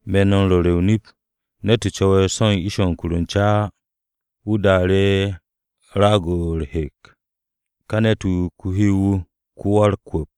“Me̱ no̱ m-ru̱re̱ o-nip, ne̱t-wu̱ cu̱we̱ so̱ u̱n ish-o̱ u̱n kuke̱-o̱ u̱n ca á, wu̱ daanu̱ru̱ raag-o̱ u̱r-hek, ka ne̱t-wu̱ ko-hyow-wu̱, ko-wa-u̱r-kwu̱p.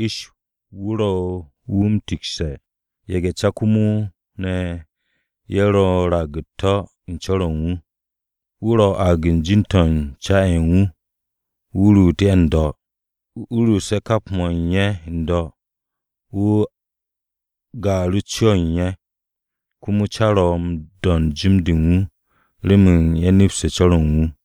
Wan-'er-de u̱n ish wu̱ ro̱ wu̱ m-tikse̱. Ye̱ge̱-ca komo ne̱ ye̱ ro̱ u̱n raag u̱t-to̱ u̱n co̱r-o̱ u̱n wu̱. Wu̱ ro̱ u̱n aag u̱n jin-to̱ u̱n ca-ye̱ u̱n wu̱, wu̱ ruut ye̱ n-do̱. Wu̱ ruuse̱ kap ye̱ ma u̱n wu̱ n-do̱, wu̱ gaaru̱ co-o̱ u̱n ye̱. Komo ca ro̱ u̱n do̱nd u̱n jim-de u̱n wu̱ remen ye̱ nepste̱ co̱r-o̱ u̱n wu̱.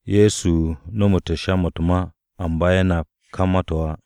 Ye̱so nomu̱te̱ ye̱ sha-mo̱ u̱t-ma, amba ye̱ nap ka ma-to̱ á.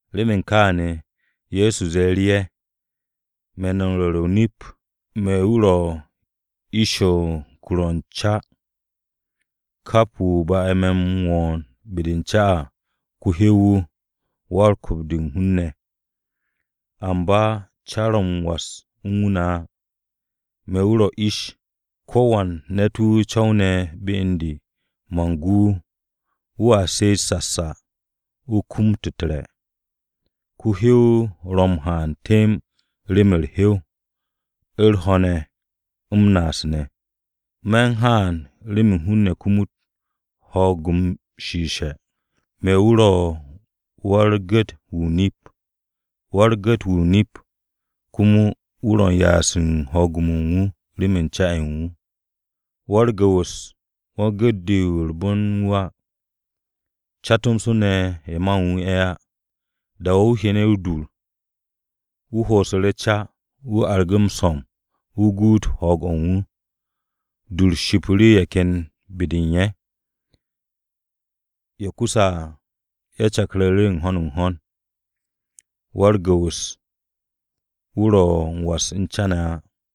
Remen kááne̱ Ye̱so ze̱e̱ru̱ ye̱, “Me̱ no̱ m-ru̱re̱ o-nip me̱ wu̱ ro̱ ish-o̱ u̱n kur-o̱ u̱n ca. Kap wu̱ ba'e̱ me̱ m-wo̱o̱n be-de u̱n ca à, ko-hyow-wu̱, wan-kwu̱p-de u̱n hun-ne̱. Amba, ca ro̱ m-was u̱n wu̱ ne̱ á. Me̱ wu̱ ro̱ ish. Ko̱wan ne̱t-wu̱ co̱wne̱ be u̱n de, man gu wu̱. Wu̱a she'et sasa, wu̱ kum u̱t-re̱. Ko-hyow ro̱ m-haan temb rem u̱r-hyow, u̱r-ho̱ ne̱ m-naas ne̱. Me̱ u̱n haan, remen hun-ne̱ kumut ho̱o̱g-m shiishe̱. “Me̱ wu̱ ro̱ wa-u̱r-gu̱t-wu̱ o-nip. Wa-u̱r-gu̱t-wu̱ o-nip komo wu̱ ro̱ u̱n ya'as u̱n ho̱o̱g-o̱ u̱n wu̱ remen ca-ye̱ u̱n wu̱. Wa-u̱r-gu̱wu̱s wan-gu̱t-de u̱r-bon wu̱ á. Ca tomso, ye̱ ma u̱n wu̱ ye̱ á. Da-o̱ wu̱ hyene̱ o-dur, wu̱ ho'osu̱ru̱ ca. Wu̱ argu̱ru̱ m-so̱m, wu̱ guut ho̱o̱g-o̱ u̱n wu̱. Dur-o shipu̱ru̱ ye̱ ken be-de u̱n ye̱. Ye̱ kuse̱ à, ye̱ cakku̱ru̱ u̱n ho̱n u̱n ho̱n. Wu̱ wa-u̱r-gu̱wu̱s, wu̱ ro̱ m-was u̱n ca ne̱ á.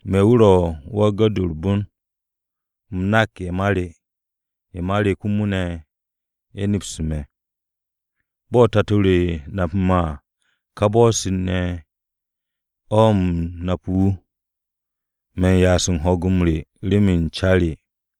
“Me̱ wu̱ ro̱ wa-u̱r-gu̱t-wu̱ u̱r-bon. U̱m nak ye̱ ma re. Ye̱ ma re komo ne̱, ye̱ nepse̱ me̱. Bo̱ Tato-o nape̱ me̱ à, ka bo̱-se ne̱ o̱ u̱m nape̱ wu̱. Me̱n ya'as u̱n ho̱o̱g re remen ca re.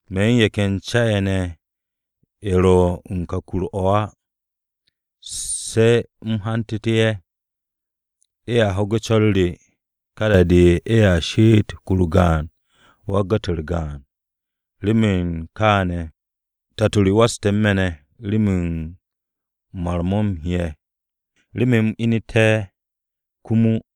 Me̱ u̱n ye̱ ken ca-ye̱ ne̱ ye̱ ro̱ u̱n o̱ ka kur-o̱ á. Se̱ u̱m hantu̱te̱ ye̱. Ye̱a ho̱ge̱ co̱r re. Ka da-de, ye̱a she'et kur-o gaan, wa-u̱r-gu̱t wan-gaan. Remen kááne̱ o̱, Tato re waste̱ u̱n me̱ ne̱ remen mar-mo̱ u̱m he'e̱, remen u̱m ineté̱ komo à.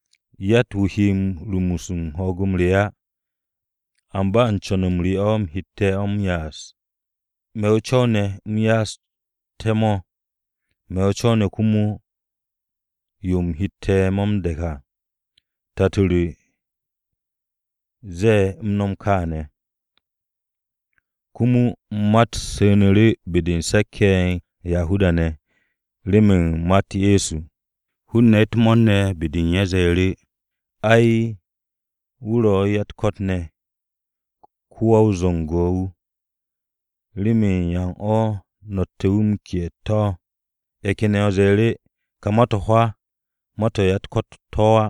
Yatt-wu̱ he rumus u̱n ho̱o̱g re á, amba u̱n co̱n-m re o̱ u̱m hette̱ mo̱ m-ya'as. Me̱ o-co̱w ne̱, u̱m ya'aste̱ mo̱. Me̱ o-co̱w ne̱ komo yo u̱m hette̱ mo̱ m-de̱ke̱n à. Tato re ze̱e̱ u̱m nom kááne̱.” Komo ma-u̱t su̱nu̱ru̱ be-de u̱n se̱k-ye̱ u̱n Yahuda-ne̱ remen ma-u̱t Ye̱so. Hun-ne̱ u̱t-mo̱o̱r ne̱ be-de u̱n ye̱ ze̱e̱ru̱, “Ai, wu̱ ro̱ u̱n ya-u̱t-ko̱t ne̱. Ko-wa-o-zu̱ngo̱ wu̱. ¿Remen yan o̱ no̱tte̱ wu̱ m-ke'e̱ u̱t-to̱?” Ye̱ ken ye̱ ze̱e̱ru̱, “Ka ma-to̱ hwaa, ma-to̱ u̱n ya-u̱t-ko̱t to̱ á.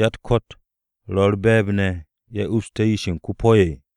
¿Ya-u̱t-ko̱t ro̱ u̱r-be̱e̱b ne̱, ye̱ upste̱ yish-ye̱ u̱n ko-po̱?”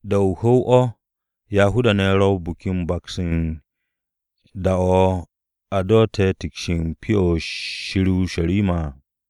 Da-o̱ o-hu̱w o̱, Yahuda-ne̱ ro̱ u̱n Biki-o̱ m-Baks u̱n da-o̱ a dotte̱ tiks u̱n Pyo-o̱ Shir o-Urusharima à.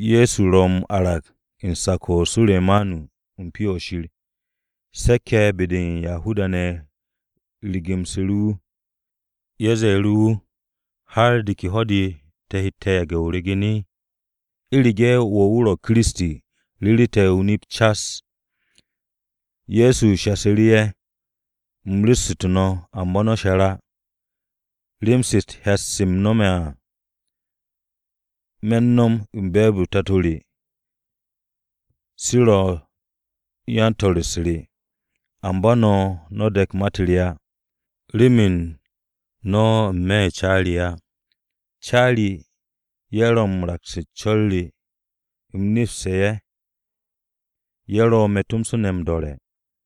Ye̱so ro m-arag u̱n sak-o Suremanu u̱n Pyo-o̱ Shir. Se̱k-ye̱ be-de u̱n Yahuda-ne̱ rigu̱msu̱ru̱ wu̱. Ye̱ ze̱e̱ru̱ wu̱, “¿Har de ke ho̱-de o̱ te̱ he yage̱ o ryegen? U̱rege̱ wo̱ wu̱ Kiristi, o ru̱ru̱ te̱ o-nip cas.” Ye̱so shasu̱ru̱ ye̱, “U̱m ru̱ssu̱tu̱ no̱, amba no̱ she̱r á. Rem-se u̱t-hyat se me̱ m-no̱m à, me̱ m-no̱m u̱n be̱e̱b-u̱r Tato re. Se ro̱ me̱ m-su̱'e̱. Amba no̱, no̱ de̱k ma-u̱t re á, remen no̱ n-me̱ u̱n ca re á. Ca re ye̱ ro̱ u̱n raks u̱n co̱r re. U̱m nepste̱ ye̱. Ye̱ ro̱ me̱ tomso ne̱ m-do̱re̱.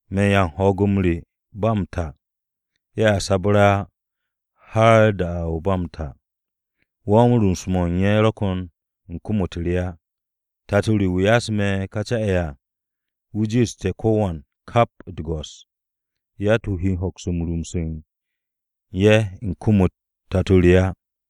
Me̱ ye̱ m-'ya u̱n ho̱o̱g-o̱ ba m-ta. Ye̱a sabre̱ á, har da-o̱ ba m-ta. Wan-rumus-mo̱ u̱n ye̱ ro̱ ko̱n u̱n kom-u̱t re á. Tato re wu̱ ya'ase̱ me̱ ka ca-ye̱ à, wu̱ jiishte̱ ko̱wan kap u̱t-go̱s. Yatt-wu̱ he hoks m-rumus u̱n ye̱ u̱n kom-u̱t Tato re á.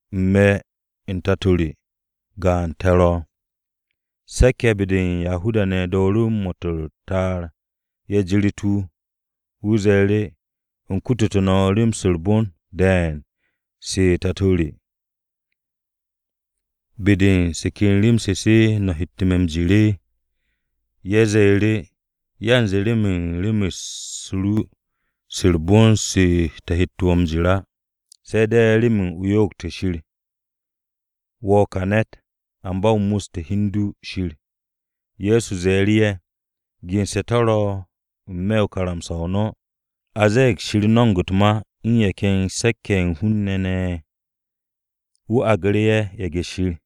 U̱n me̱ u̱n Tato re, gaan te̱ ro̱.” Se̱k-ye̱ be-de u̱n Yahuda-ne̱ dooru̱ mo̱t u̱t-ta'ar, ye̱ jirit wu̱. Ye̱so ze̱e̱ru̱, “U̱m kutute̱ no̱ rem-se u̱r-bon de̱e̱n se u̱n Tato re. ¿Be-de u̱n se ke rem-se, se ne̱ no̱ hette̱ me̱ m-jir?” Ye̱ ze̱e̱ru̱, “Yanze remen rem-u̱s ru se u̱r-bon se te̱ hette̱ wo̱ m-jir á, se̱ de̱ remen o yo'ogte̱ Shir. Wo̱ ka ne̱ ne̱t-wu̱, amba wo̱ m-mus u̱n hi u̱n du Shir.” Ye̱so ze̱e̱ru̱ ye̱, “Gense̱ to̱ ro̱ n-me̱ u̱n karamsa-o no̱. A zee Shir no̱mo̱g u̱t-ma u̱n ye̱ ken se̱k-ye̱ ye̱ u̱n hun-ne̱ ye̱ ne̱, wu̱ aagu̱ru̱ ye̱ ‘ye̱ge̱-shir.’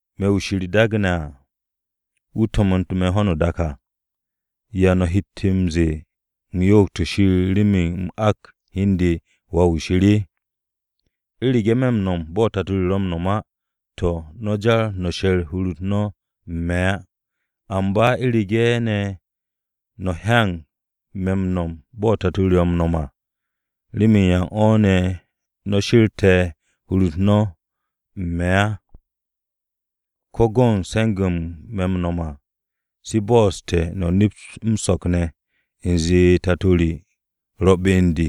Me̱ wu̱ Shir daage̱ à, wu̱ to̱mo̱n u̱n ho̱no o-dak à, ¿Ya no̱ hette̱ m-ze̱e̱ u̱m yo'ogte̱ Shir remen u̱m ak hi u̱n de ‘Wà-wu̱ Shir’? U̱rege̱ me̱ m-no̱m bo̱ Tato re ro̱ m-no̱m á, to̱, no̱ jar no̱ she̱r hur-u̱t no̱ u̱n me̱ á. Amba u̱rege̱ ne̱ no̱ hyanag me̱ m-no̱m bo̱ Tato re ro̱ m-no̱m à, ¿remen yan o̱ no̱ she̱rte̱ hur-u̱t no̱ u̱n me̱ ne̱ á? Ko̱ go̱n se̱nge̱-mo̱ me̱ m-no̱m à, mo̱ bo̱'o̱ssu̱te̱ no̱ nept m-so̱k ne̱, u̱nze Tato re ro̱ be u̱n de,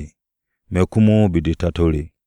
me̱ komo ne̱ be-de o-Tato.”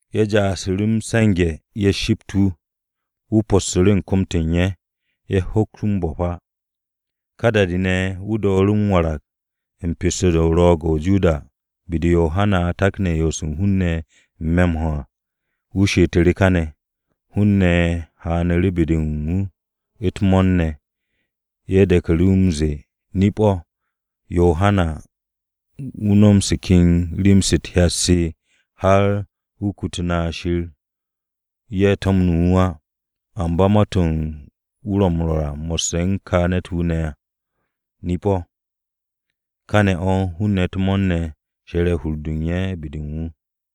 Ye̱ ja'asu̱ru̱ m-se̱nge̱, ye̱ shipt wu̱. Wu̱ possu̱ru̱ u̱n kom-to̱ u̱n ye̱. Ye̱ hoks wu̱ m-bo̱p á. Ka da-de ne̱, wu̱ dooru̱ m-warag u̱n pesto-de u̱n Ro̱o̱g-o̱ o-Joda be-de Yohana takne̱ yo'os u̱n hun-ne̱ n-me̱ m-ho̱ à. Wu̱ she'etu̱ru̱ kane̱. Hun-ne̱ haanu̱ru̱ be-de u̱n wu̱ u̱t-mo̱o̱r ne̱. Ye̱ de̱ku̱ru̱ m-ze̱e̱, “Nip-o̱, Yohana, wu̱ no̱m se ken rem-se u̱t-hyat se har wu̱ kututu̱ na Shir ye̱ to̱mne̱ wu̱ á, amba ma-to̱ wu̱ ro m-rwo̱r mo̱sse̱ u̱n ka ne̱t-wu̱ ne̱ à, nip-o̱.” Káne̱ o̱ hun-ne̱ u̱t-mo̱o̱r ne̱ she̱re̱ hur-de u̱n ye̱ be-de u̱n wu̱.